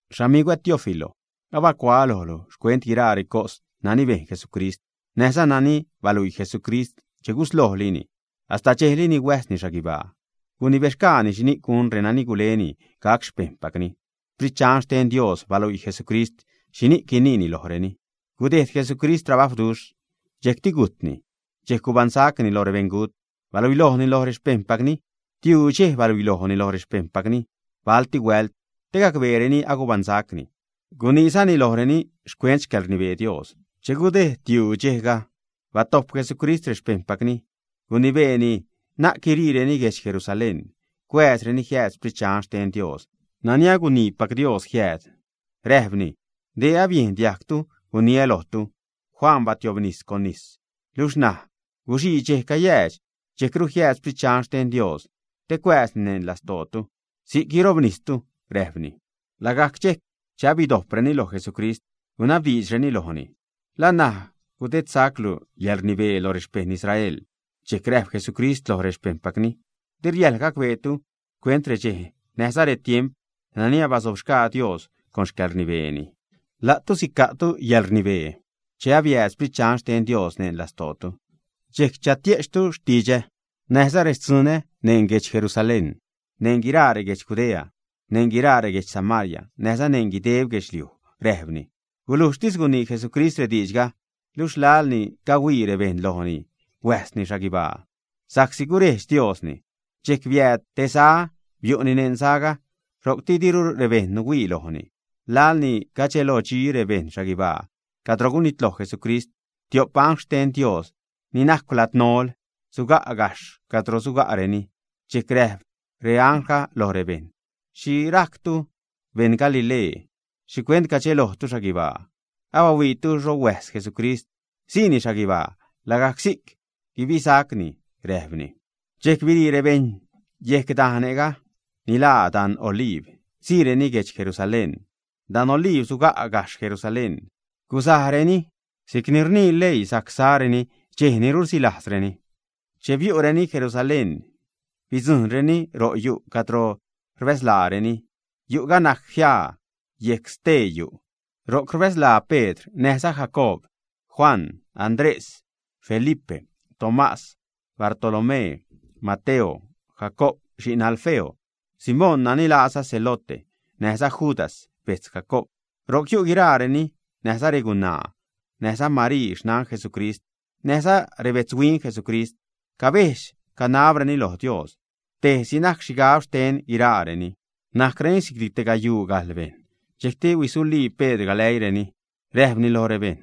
Xamigwä Teófilo, abacuaä lojlu xcuent guiraa recos nani bejn Jesucrist näjza nani baluii Jesucrist, che guslojlini, hasta dxejli ni huäjsni xhaguibaa. Gunibexgaani xhini'c gun renani guleni gac xpejṉpacni. Sprit Dxan xten Dios baluii Jesucrist xhi guiniini lojreni. Gudejd Jesucrist trabajwduxh, dxejcti gujtni. Dxejc gubaṉsacni lo rebeṉgut, baluilojni lo rexpejṉpacni. Tiuu dxej baluilojni loj rexpejṉpacni balti huält te gacbeereni agubaṉsacni. Guniizani lojreni xcuent xcäḻrnibee Dios. Che gudejd tiuu dxejga, batojp Jesucrist rexpejṉpacni, gunibeeni na'c guiriireni guedx Jerusalén, cuääzreni jiääd Sprit Dxan xten Dios nani aguniipac Dios jiääd. Räjpni: ―Dee abiejn diajgtu guniä́ lojtu. Juan batiobnis con nis, luxh ṉaj guxii dxej cayäädx dxejcru siääd Sprit Dxan xten Dios te cuääzni neṉ lastootu. Si'c guirobnistu ―räjpni. Lagajc dxejc che abidojpreni loj Jesucrist, gunabdiidxreni lojni: ―¿La ṉaj gudedsaclu yäḻrnibee lo rexpejṉ Israel, ä? Dxejcti räjp Jesucrist loj rexpejṉpacni: ―Di riäjḻ gacbeetu xcuent redxej näjza retiemp nani abasobxgaa Dios con xcäḻrnibeeni. La'tu sica'tu yäḻrnibee che abiääd Sprit Dxan xten Dios neṉ lastootu. Dxejc chatie'chtu xtidxä näjza rextzunä neṉ guedx Jerusalén, neṉ guiraa reguedx Judea, neṉ guiraa reguedx Samaria, näjza neṉ guideb guedxliuj ―räjpni. Gulujxtis gunii Jesucrist rediidxga, luxh laḻni cahuii rebejṉ lojni huäjsni xhaguibaa, sa'csi gurejdx Diosni. Dxejc biääd te za, biu'ni neṉ zaga. Ro'cti diru rebejṉ nuhuii lojni. Laḻni cadxelodxi rebejṉ xhaguibaa cadro gunitloj Jesucrist, tiop angl xten Dios ni najcw ladnol suga' gajxh cadro suga'reni. Dxejc räjp reangl loj rebejṉ: ―¿Xhi rajctu beṉ Galilee? ¿Xhicuent cadxelojtu xhaguibaa? Abahuiitu xho huäjs Jesucrist siini xhaguibaa. Lagajc si'c guibisacni ―räjpreni. Dxejc birii rebejṉ yejc dajne' ni laa Dan Oliib, siireni guedx Jerusalén. Dan Oliib suga' gajxh Jerusalén. Gusajrenini si'cni rnii leii sajc sareni dxej ni rusilajzreni. Che biu'reni Jerusalén, bidzujṉreni ro' yu' cadro rbäzlaareni. Yu'ga najc jiaa yejc stee yu'. Ro'c rbäzlaa Pedr näjza Jacoob, Juan, Andrés, Felipe, Tomás, Bartolomé, Mateo, Jacoob xi'n Alfeo, Simón nani laaza Zelote, näjza Judas bejtz Jacoob. Ro'c yu' guiraareni näjza regunaa näjza Marii xnan Jesucrist näjza rebetzhuin Jesucrist. Cabejdx, canabreni loj Dios; tejsi najc xhigab xten guiraareni. Nadxagsa' te gayuu gajḻ bejṉ. Dxejcti huisulii Pedr galäiireni, räjpni loj rebejṉ: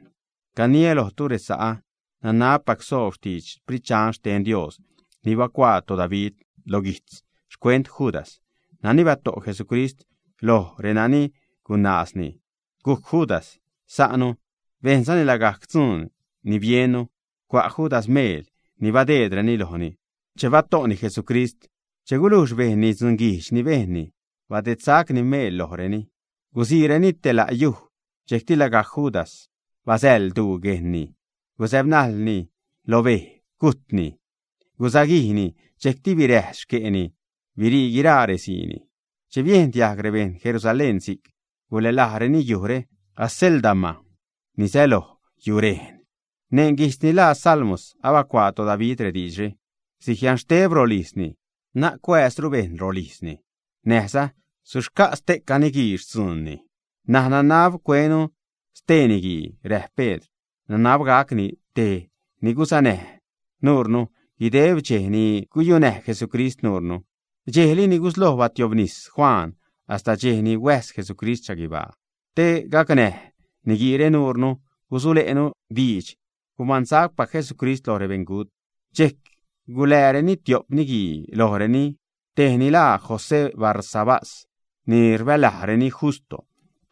―Caniä lojtu, resa'ä, nanabpac soob xtidx Sprit Dxan xten Dios ni bacuaa toDavid lo guijtz xcuent Judas, nani bato' Jesucrist loj renani gunaazni. Gujc Judas sa'nu, bejnzani lagajc dzuun ni biennu. Cua' Judas meel ni badeedreni lojni che bato'ni Jesucrist. Che gulujx bejnni dzunguijdx ni bejnni, badedsacni meel lojreni. Gusiireni te la' yuj. Dxejcti lagajc Judas basäḻ duu guejnni, guzäbnajḻni lo bej, gujtni. Gusaguijni, dxejcti biräjs xque'ni birii guiraa reziini. Che biejn diajg rebejṉ Jerusalén si'c, gulälajreni yujre Acéldama, ni säloj yurejn. Neṉ guijtz ni ḻaa Salmos abacuaa toDavid rediidxre: Sujianxteb rolijzni; na'c cuääzru bejṉ rolijzni; näjza: Suxca'za ste'ca niguii xtzuunni. N̲aj nanab cuenu stee niguii ―räjp Pedr―. Nanab gacni tej ni gusanäj nuunu guideb redxej ni guyunäj Jesucrist nuunu, dxejli ni gusloj batiobnis Juan hasta dxej ni huäjs Jesucrist xhaguibaa. Te gacnäj niguiire nuunu gusule'nu diidx gubaṉsacpac Jesucrist lo rebeṉgut. Dxejc gulääreni tiop niguii lojreni, tejni laa José Barsabás ni rbälajreni Justo,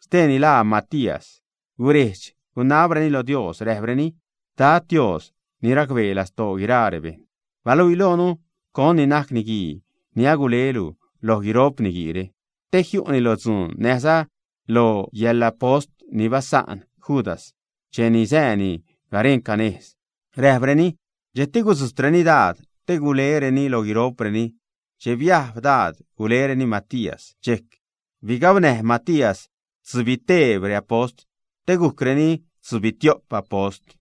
steeni laa Matías. Gurejdx, gunabreni lo Dios, räjpreni: ―Dad, Dios, ni racbee lastoo guiraa rebejṉ, baluii loonu con ni najc niguii ni agulelu loj guiro'p niguiire, te jiu'ni lo dzuun näjza lo yäḻapost ni basa'n Judas cheni sääni garenca nejz ―räjpreni. Dxejcti gudzujtreni daad te gulereni lo guiro'preni. Che biajb daad, gulereni Matías. Dxejc bigabnäj Matías stzubiteeb reapost te gujcreni tzubitio'p apost.